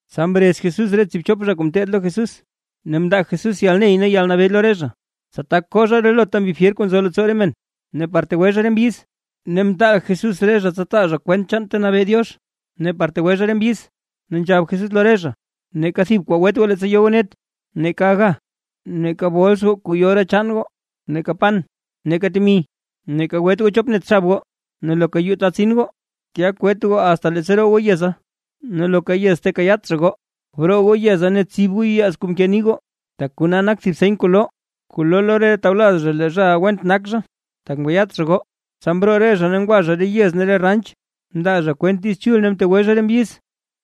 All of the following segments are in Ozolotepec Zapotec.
Tsa mrez Jesús re tsiibchop zha kuu ngeteed lo Jesús, ne mndaa Jesús yalney ne yalnabee lo re zha, tsa tak koo zha relota mbi fyer kuu nzo leettsoo re men, ne par tegwe zha re mbyiz. Ne mtaal Jesús re zha tsa taa zha kwent chaan ta nabee Diox, ne par tegwe zha re mbyiz. Ne nzhab Jesús lo re zha: ―Neeka thib kwaa gwet goo leettsa yo goo net, neeka aga, neeka bols goo kuu yo re chaan goo, neeka pan, neeka temi; ne neeka gwet goo chop net xab goo. Ne loka yuu ta tsin goo, tya kwet goo asta leettsa roo goo yeza. Ne loka yez ta kayaat zha goo, broo goo yeza ne btsib goo yuyaaz kuu mke nii goo, tak kona nak thib seny kuu loo lo re tawlaz zha lee re zhaʼa went nak zha, tak mkayaat zha goo. Tsa mroo re zha ne ngwa zha re yez ne re ranch, mndaa zha kwent Diiz Chul ne mtegwe zha re mbyiz.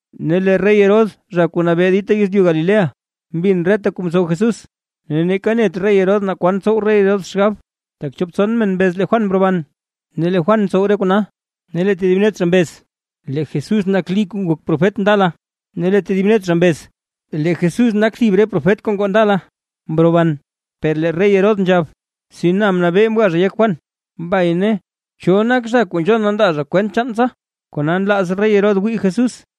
Ne lee rey Herodes zha kuu nabee dita yezlyu Galilea mbin reta kuu mtsow Jesús; ne neeka net rey Herodes naa kwan tsow rey xgab, tak chop tson men mbez lee Juan mroban, ne lee Juan ntsow re kona. Ne lee tedib net zha mbez lee Jesús nak Lí kuu ngok profet ndala, ne lee tedib net zha mbez lee Jesús nak thib re profet kuu ngoo ndala, mroban. Per lee rey Herodes nzhab: ―Si na mnabee mga zha yek Juan. Mbay ne, ¿cho nak zha kuu nzhon na ndaa zha kwent chaan tsa? Kona nlaaz rey Herodes wii Jesús.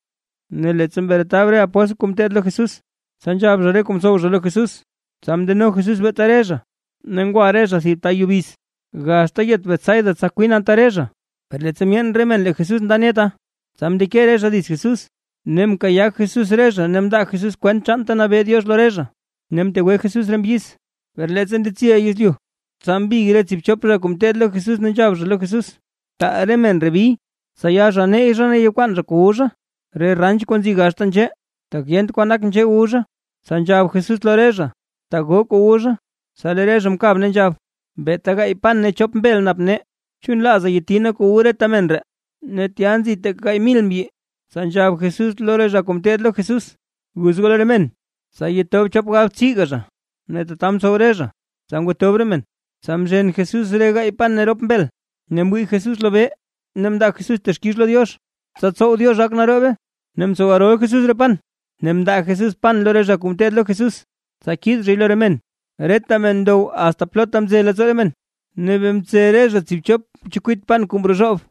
Ne leettsa mretab re kuu ngeteed lo Jesús, tsa nzhab zha re kuu mtsow zha lo Jesús. Tsa mndeno Jesús beeta re zha, ne ngwa re zha thib ta yubiz, gaxta yez Betsaida tsa kwin anta re zha. Per leettsa myeen re men lee Jesús nda neta, tsa mndeke re zha dits Jesús, ne mkayaa Jesús re zha ne mndaa Jesús kwent chaan ta nabee Diox lo re zha, ne mtegwe Jesús re mbyiz. Per leettsa ndetsiy yezlyu, tsa mbig re tsiibchop zha kuu ngeteed lo Jesús ne nzhab zha lo Jesús: ―Taal re men ree bi, tsa ya zha neyy zha ne yakwaan zha kuu wu zha, re ranch kuu nzi gaxta nzhee; tak yent kwan nak nzhee wu zha. Tsa nzhab Jesús lo re zha: ―Taa goo kuu wu zha. Tsa lee re zha mkab, ne nzhab: ―Beeta gaay pan ne chop mbel nap nee, chu nlaaza yati nee kuu wu reta men ree. Ne tya nzi teeka gaay mil mbyi. Tsa nzhab Jesús lo re zha kuu ngeteed lo Jesús: ―Guz goo lo re men, tsa yetob chop galbtsiiga zha. Ne tata mtsow re zha, tsa ngwatob re men. Tsa mzhen Jesús re gaay pan ne rop mbel, ne mwii Jesús lobee ne mndaa Jesús texkix lo Diox, tsa tsow Diox gak naroobe, ne mtsow rol Jesús re pan ne mndaa Jesús pan lo re zha kuu ngeteed lo Jesús, tsa kiid zhay lo re men. Reta men ndow asta plotha mze leettsoo re men; ne bee mtse re zha tsiibchop chekwit pan kuu mrozhoob.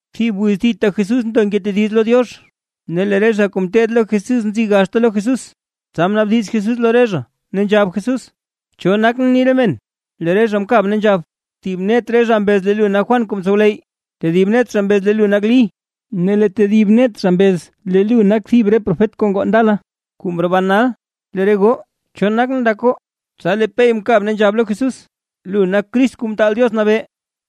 Thib wiz thita Jesús ndo ngetediz lo Diox, ne lee re zha kuu ngeteed lo Jesús nzi gaxta lo Jesús, tsa mnaabdiz Jesús lo re zha, ne nzhab Jesús: ―¿Cho nakʼn ni re men? Lee re zha mkab ne nzhab: ―Thib net zha mbez lee lu nak Juan kuu mtsowleyy, tedib net zha mbez lee lu nak Lí, ne lee tedib net zha mbez lee lu nak thib re profet kuu ngoo ndala, kuu mroban nal. ―Lee re goo, ¿cho nakʼn ndak goo? Tsa lee Pey mkab, ne nzhab lo Jesús: ―Lu nak Crist Kuu Mtaal Diox Nabee.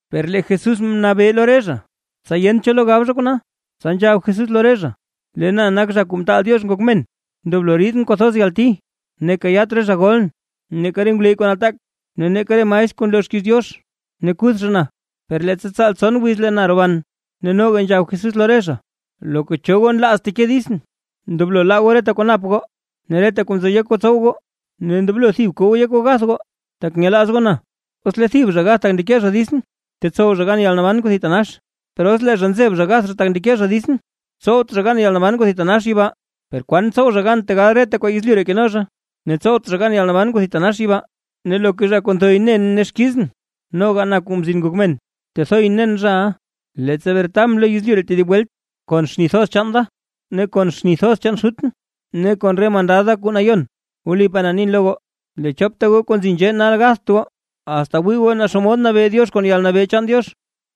Per lee Jesús mnabee lo re zha, tsa yent cho lo gab zha kona. Tsa nzhab Jesús lo re zha: ―Lee na nak Zha Kuu Mtaal Diox Ngok Men, ndoblo riidʼn kwathoz yalti. Ne kayaat re zha golʼn, neeka re ngwleyy kuu nataak, ne neeka re maestr kuu nloo xkiiz Diox. Ne kuth zha na, per leettsa tsaal tson wiz lee na roban. Ne noga nzhab Jesús lo re zha: ―Loka cho goo nlaaz teke ditsʼn, ndoblo laa goo reta kuu nap goo, ne reta kuu nzo yek goo tsow goo, ne ndoblo thib ko goo yek goo gath goo, tak nyelaaz goo na. Os lee thib zha gath tak ndeke zha ditsʼn, tetsow zha gan yalnaban kuu thitanax. Per os lee zha nzeb zha gath zha tak ndeke zha ditsʼn, tsowt zha gan yalnaban kuu thitanax yibaa. ¿Per kwan tsow zha gan tegal reta kwaa yezlyu ree keno zha, ne tsowt zha gan yalnaban kuu thitanax yibaa? Ne loka zha kuu nthoy nen ne xkizʼn, noga na Kuu Mzin Ngok Men, tethoyʼn nen zhaʼa, leettsa bretabʼn lo yezlyu ree tedib welt kon xni thoz chaan da, ne kon xni thoz chaan Xutʼn ne kon re mandad da kuu nayon. Wlipaa na nin lo goo, lee chopta goo kuu nzi nzhee nal gatht goo, asta wii goo naa xomod nabee Diox kon yalnabee chaan Diox.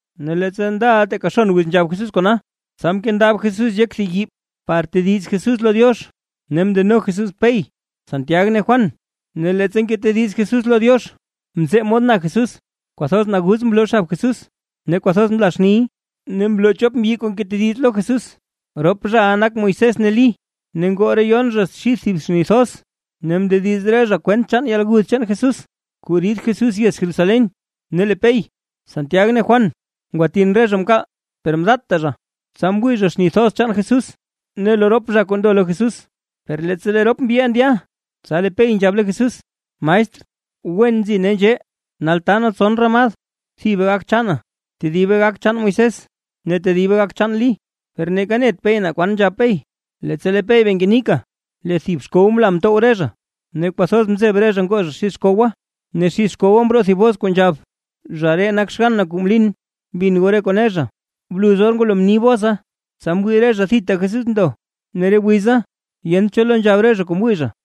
Ne leettsa ndaʼa teeka xon wiz nzhab Jesús kona, tsa mkendab Jesús yek thib yii par tediz Jesús lo Diox. Ne mndeno Jesús Pey, Santiag ne Juan. Ne leettsa ngetediz Jesús lo Diox, mzee mod na Jesús, kwathoz naguz mloo xab Jesús, ne kwathoz mla xniy. Ne mloo chop mbyi kuu ngetediz lo Jesús. Rop zhaʼa nak Moisés ne Lí. Ne ngoo re yon zha xid thib xni thoz, ne mndediz re zha kwent chaan yalguth chaan Jesús, kuu rid Jesús yez Jerusalén. Ne lee Pey, Santiag ne Juan ngwatin re zha mkaal, per mdatta zha, tsa mwii zha xni thoz chaan Jesús ne lo rop zha kuu mndo lo Jesús. Per leettsa lee rop mbyiʼa ndya, tsa lee Pey nzhab lo Jesús: ―Maestr, ¡wen nzi nee nzhee! Nal taa nee tson ramad, thibe gak chaana, tedibe gak chaan Moisés ne tedibe gak chaan Lí. Per neeka net Pey naa kwan nzhab Pey. Leettsa lee Pey bee ngenika lee thib xkow mla mtow re zha, ne kwathoz mzeb re zha ngoo zha xid xkowa. Ne xid xkowa mroo thib bos kuu nzhab: ―Zha ree nak xgann na kuu mlin. Bin goo re kuu ne zha. Bluz or ngwalo mni bosa, tsa mwii re zha thita Jesús ndo. Ne re wiza yent cho lo nzhab re zha kuu mwii zha.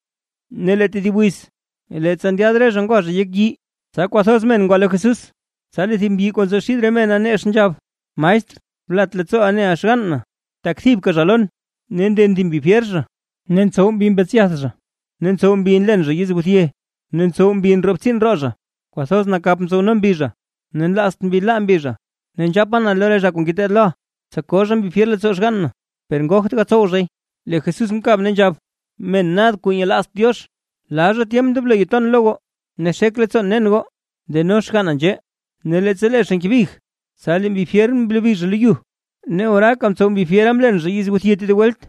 Ne lee tedib wiz, leettsa ndyaad re zha ngwa zha yek yii, tsa kwathoz men ngwa lo Jesús. Tsa lee thib mbyi kuu nzo xid re mena, nex nzhab: ―Maestr, blat leettsooʼa neʼa xgann na, tak thibka zha lon. Ne nden thib mbi fyer zha, ne ntsow mbi mbetsyath zha, ne ntsow mbi nlen zha yizguthye, ne ntsow mbi ndroo btsiin roo zha. Kwathoz nakap ntsowno mbi zha ne nlaazt mbi laa mbi zha. Ne nzhapa na lo re zha kuu ngeteed loʼa, tsa koo zha mbi fyer leettsoo xgann na, per ngogt gatsow zhay. Lee Jesús mkab ne nzhab: ―¡Men nad, kuu nyelaazt Diox! ¿Plal tyemp ndoblo ton lo goo ne xek leettsoon nen goo? Deno xganna nzhee. Ne leettsa lee zha ngebig, tsa lee mbi fyer mlobi zha lo yu, ne oraaka mtsow mbi mlen zha yizguthye tedib welt.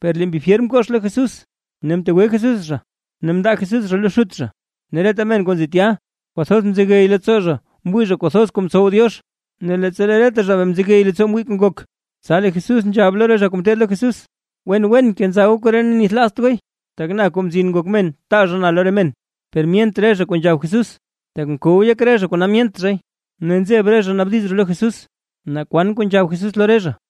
Per lee mbi fyer mkox lo Jesús, ne mtegwe Jesús zha, ne mndaa Jesús zha lo xut zha. Ne reta men kuu nzi tya, kwathoz mzegey leettsoo zha mwii zha kuu thoz kuu mtsow Diox. Ne leettsa lee reta zha bee nzegey leettsoo mwii kuu ngok, tsa lee Jesús nzhab lo re zha kuu ngeteed lo Jesús: ―Wen wen kenza goo koree ne nithlaazt gooy, tak na, Kuu Mzin Ngok Men, taa zha na lo re men. Per myent re zha kuu nzhab Jesús, tak mkow yek zha kona myent zha. Ne nzeb re zha naabdiz zha lo Jesús, naa kwan kuu nzhab Jesús lo re zha.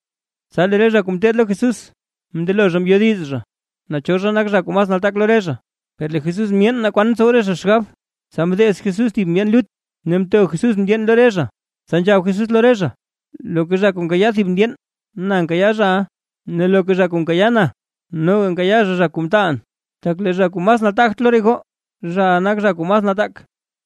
Tsa lee re zha kuu ngeteed lo Jesús mndelo zha mbyodiz zha naa cho nak zha kuu mas nataak lo re zha. Per lee Jesús myeen naa kwan ntsow re zha xgab, tsa mdeez Jesús thib ndyeen lut, ne mto Jesús ndyeen lo re zha. Tsa nzhab Jesús lo re zha: ―Loka zha kuu nkayaa thib ndyeen, na nkayaa zhaʼa, ne loka zha kuu nkayaa na, noga nkayaa zha, zha kuu mtaalʼn. Tak lee zha kuu mas nataagt lo re goo, zhaʼa nak zha kuu mas nataak.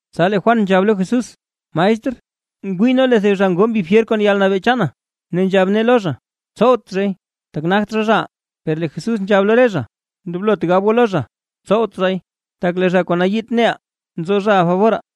Tsa lee Juan nzhab lo Jesús: ―Maestr, mwii nee lee thib zha ngoo mbi fyer kon yalnabee chaana, ne nzhab nee lo zha: “Tsowt zhay”, tak nagt zha, zhaʼaa. Per lee Jesús nzhab lo re zha: ―Ndoblot gab goo lo zha: “Tsowt zhay”, tak lee zha kuu nayiit neʼaa, nzo zhaʼa faboraa.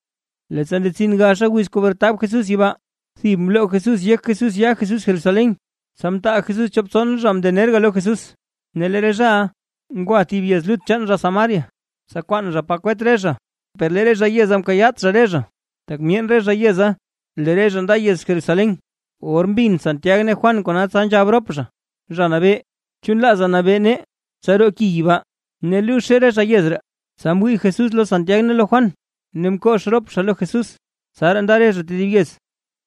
Leettsa ndetsin gaxa wiz kuu bretab Jesús yibaa, thib mloo Jesús yek Jesús ya Jesús Jerusalén. Tsa mtaal Jesús chop tson zha mndenerga lo Jesús, ne lee re zhaʼa ngwa thib yez lut chaan zha Samaria, tsa kwaan zha pa kwet re zha. Per lee re zha yeza mkayaat zha re zha, tak myeen re zha yeza lee re zha nda yez Jerusalén. Or mbin Santiag ne Juan kona, tsa nzhab rop zha: ―Zha Nabee, ¿chu nlaaza nabee nee tsa roo ki yibaa, ne luuzhe re zha yez ree? Tsa mwii Jesús lo Santiag ne lo Juan, ne mkox rop zha lo Jesús. Tsaraa nda re zha tedib yez.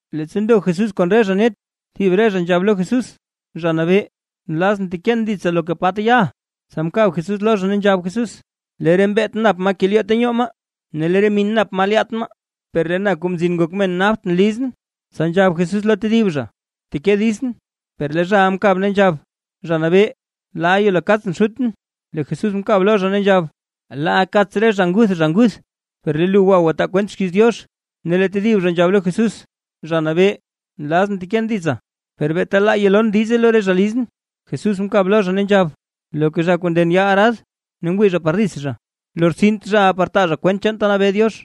Leettsa ndo Jesús kon re zha net, thib re zha nzhab lo Jesús: ―Zha Nabee, nlazʼn teken ditsa loka pa ta yaʼa. Tsa mkab Jesús lo zha, ne nzhab Jesús: ―Lee re mbeet nap maa kelyoo ta nyoo maa, ne lee re min nap maa lyaat maa; per lee na, Kuu Mzin Ngok Men napt lizʼn. Tsa nzhab Jesús lo tedib zha: ―Bteke ditsʼn. Per lee zhaʼa mkab, ne nzhab: ―Zha Nabee, laa yelo kaatsʼn xutʼn. Lee Jesús mkab lo zha, ne nzhab: ―Laa kaats re zha nguth zha nguth; per lee lu gwa gwataa kwent xkiiz Diox. Ne lee tedib zha nzhab lo Jesús: ―Zha Nabee, nlazʼn teken ditsa, per beeta laaʼa yalon diize lo re zha lizʼn. Jesús mkab lo zha, ne nzhab: ―Loka zha kuu nden yaa arad ne ngwii zha par dits zha, lortsint zhaʼa par taa zha kwent chaan ta nabee Diox.